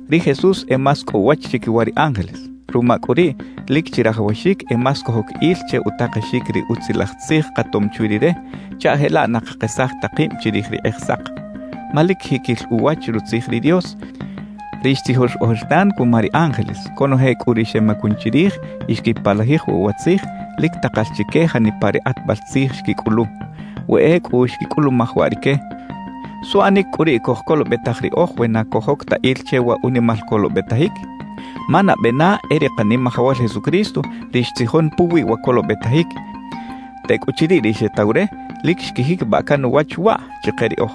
Ri Jesús e más cꞌo uwach chiquiwa ri ángeles; ruma cꞌu riꞌ, lic chirajawaxic e más cojoc il che utakexic ri Utzilaj Tzij katom chwi Rire, chaꞌ jelaꞌ na cakesaj ta kib chirij ri Kꞌijsak. Ma lic jiquil uwach Rutzij ri Dios, ri xtzijox ojertan cuma ri ángeles; conoje cꞌu ri xemacun chirij y xquipalajij waꞌ wa Tzij, lic takal chique janipa ri kꞌatbal tzij xquicꞌulu. We ecꞌu xquicꞌulumaj waꞌ rique, ¿suꞌanic cꞌu riꞌ cojcolobetaj riꞌoj we na cojoc ta il che wa unimal colobetajic? Ma nabe na e ri Kanimajawal Jesucristo ri xtzijon puwi wa colobetajic; tecꞌuchiriꞌ ri xetaw re, lic xquijiquibaꞌ can uwach waꞌ chike riꞌoj.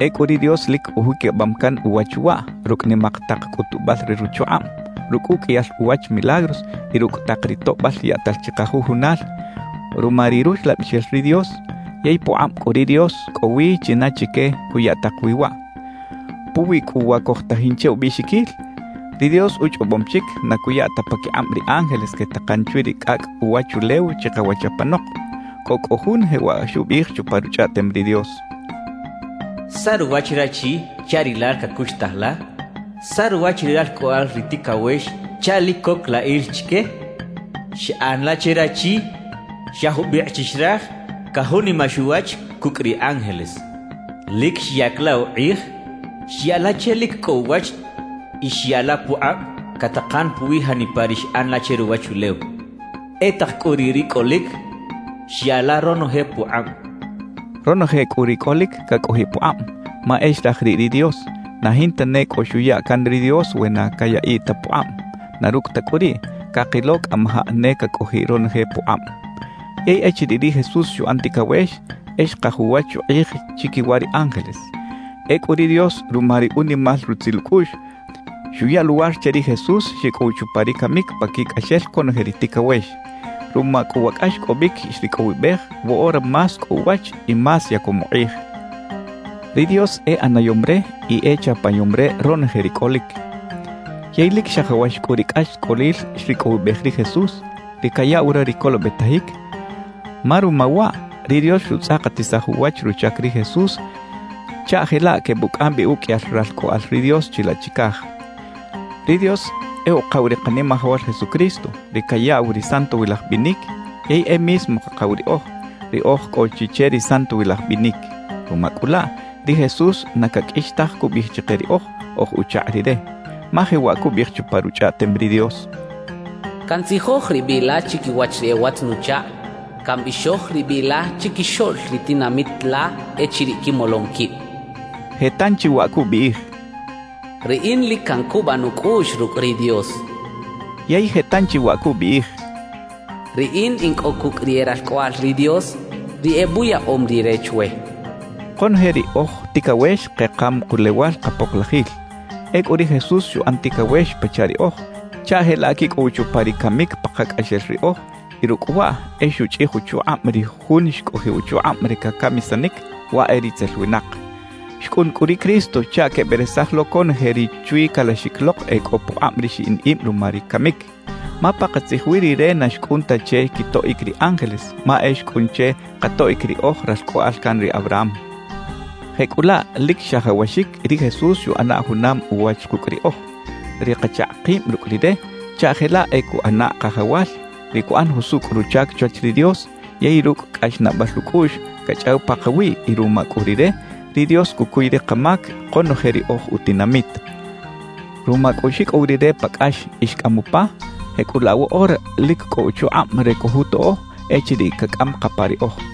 Ecꞌu ri Dios lic ujiquibam can uwach waꞌ rucꞌ nimak tak cꞌutubal re ruchukꞌab, rucꞌ uqꞌuiyal uwach milagros y rucꞌ tak ri toꞌbal yaꞌtal chikajujunal ruma ri Ruxlabixel ri Dios, yey pukꞌab cꞌu ri Dios cꞌo wi china chique cuya tak wi waꞌ. Puwi cꞌu wa cojtajin che ubiꞌxiquil, ri Dios uchꞌobom chic na cuya ta paquikꞌab ri ángeles quetakan chwi ri cꞌacꞌ uwachulew chikawach apanok. Cꞌo cꞌu jun jewaꞌ xubiꞌij chupa Ruchꞌaꞌtem ri Dios: ¿Saꞌ ruwach rachi chaꞌ Rilal cacuxtaj la? ¿Saꞌ ruwach ri ralcꞌoꞌal ri ticawex chaꞌ lic coc la il chique? Xꞌan la che rachi xa jubikꞌ chi xraj cajunimax uwach cucꞌ ri ángeles. Lic xyac la ukꞌij, xya la che lic cꞌo uwach y xya la pukꞌab catakan puwi janipa ri xꞌan la che ruwachulew. E tak cꞌu riꞌ ri cꞌolic, xya la ronoje pukꞌab xchaꞌ. Ronoje cꞌu ri cꞌolic cacꞌojiꞌ pukꞌab, ma e xraj riꞌ ri Dios; na jinta ne cꞌo xuya can ri Dios we na cayaꞌiꞌ ta pukꞌab. Na rucꞌ ta cꞌu riꞌ, cakilo cꞌamajaꞌ ne cacꞌojiꞌ ronoje pukꞌab. Yey echiriꞌ ri Jesús xuꞌan ticawex, e xkaj uwach ukꞌij chiquiwa ri ángeles. Ecꞌu ri Dios ruma ri unimal rutzil ucꞌuꞌx, xuya luwar che ri Jesús xicꞌow chupa ri camic paquicꞌaxel conoje ri ticawex. Ruma cꞌu wa cꞌaxcꞌobic xricꞌowibej, woꞌora más cꞌo uwach y más yacom ukꞌij. Ri Dios e ꞌanayom re y e chapayom re ronoje ri cꞌolic. Yey lic xajawax cꞌu ri cꞌaxcꞌolil xricꞌowibej ri Jesús, ri cayaꞌw re ri colobetajic, ma ruma waꞌ ri Dios xutzꞌakatisaj uwach ruchac ri Jesús chaꞌ jelaꞌ quebucꞌam bi uqꞌuiyal ralcꞌoꞌal ri Dios chilaꞌ chicaj. Ri Dios e Ukaw ri Kanimajawal Jesucristo, ri cayaꞌw ri santowilaj binic; yey e mismo Kakaw riꞌoj, ri oj cꞌo chi che ri santowilaj binic. Ruma cꞌu laꞌ, ri Jesús na caqꞌuix taj cubiꞌij chike riꞌoj, oj uchakꞌ Rire. Ma jewaꞌ cubiꞌij chupa Ruchꞌaꞌtem ri Dios: Cantzijoj ri biꞌ la chiquiwach ri e watz-nuchakꞌ, Cambixoj ri biꞌ la chiquixoꞌl ri tinamit la echiriꞌ quimolom quib. Je tanchi waꞌ cubiꞌij: Riꞌin lic cancubaꞌ nucꞌuꞌx rucꞌ ri Dios. Yey je tanchi waꞌ cubiꞌij: Riꞌin in cꞌo cucꞌ ri e ralcꞌoꞌal ri Dios, ri ebuyaꞌom Rire chwe cachaꞌ. Konoje ri oj ticawex kekam kulewal kapoklajil. Ecꞌu ri Jesús xuꞌan ticawex pachaꞌ riꞌoj, chaꞌ jelaꞌ quicꞌow chupa ri camic pakacꞌaxel riꞌoj y rucꞌ waꞌ e xuchꞌij uchukꞌab ri jun xcꞌojiꞌ uchukꞌab re cacamisanic, waꞌ e ritzel winak. Xcꞌun cꞌu ri Cristo chaꞌ queberesaj lo conoje ri chwi calaxic lok e cꞌo pukꞌab ri xiꞌin ib ruma ri camic. Ma pakatzij wi Rire na xcꞌun ta che quitoꞌic ri ángeles, ma e xcꞌun che katoꞌic ri oj ralcꞌoꞌal can ri Abraham. Jecꞌulaꞌ lic xajawaxic ri Jesús xuꞌana junam uwach kucꞌ riꞌoj, ri kachakꞌ kib rucꞌ Rire, chaꞌ jelaꞌ e cuꞌana Kajawal, ri cuꞌan jusucꞌ ruchac chwach ri Dios, yey rucꞌ cꞌaxnaꞌbal ucꞌuꞌx cachꞌaw pakawiꞌ y ruma cꞌu Rire, ri Dios cucuy ri kamac konoje ri oj utinamit. Ruma cꞌu xicꞌow Rire pa cꞌax y xcꞌam upa, jecꞌulaꞌ woꞌora lic cꞌo uchukꞌab re cojutoꞌo echiriꞌ cacꞌam kapa riꞌoj.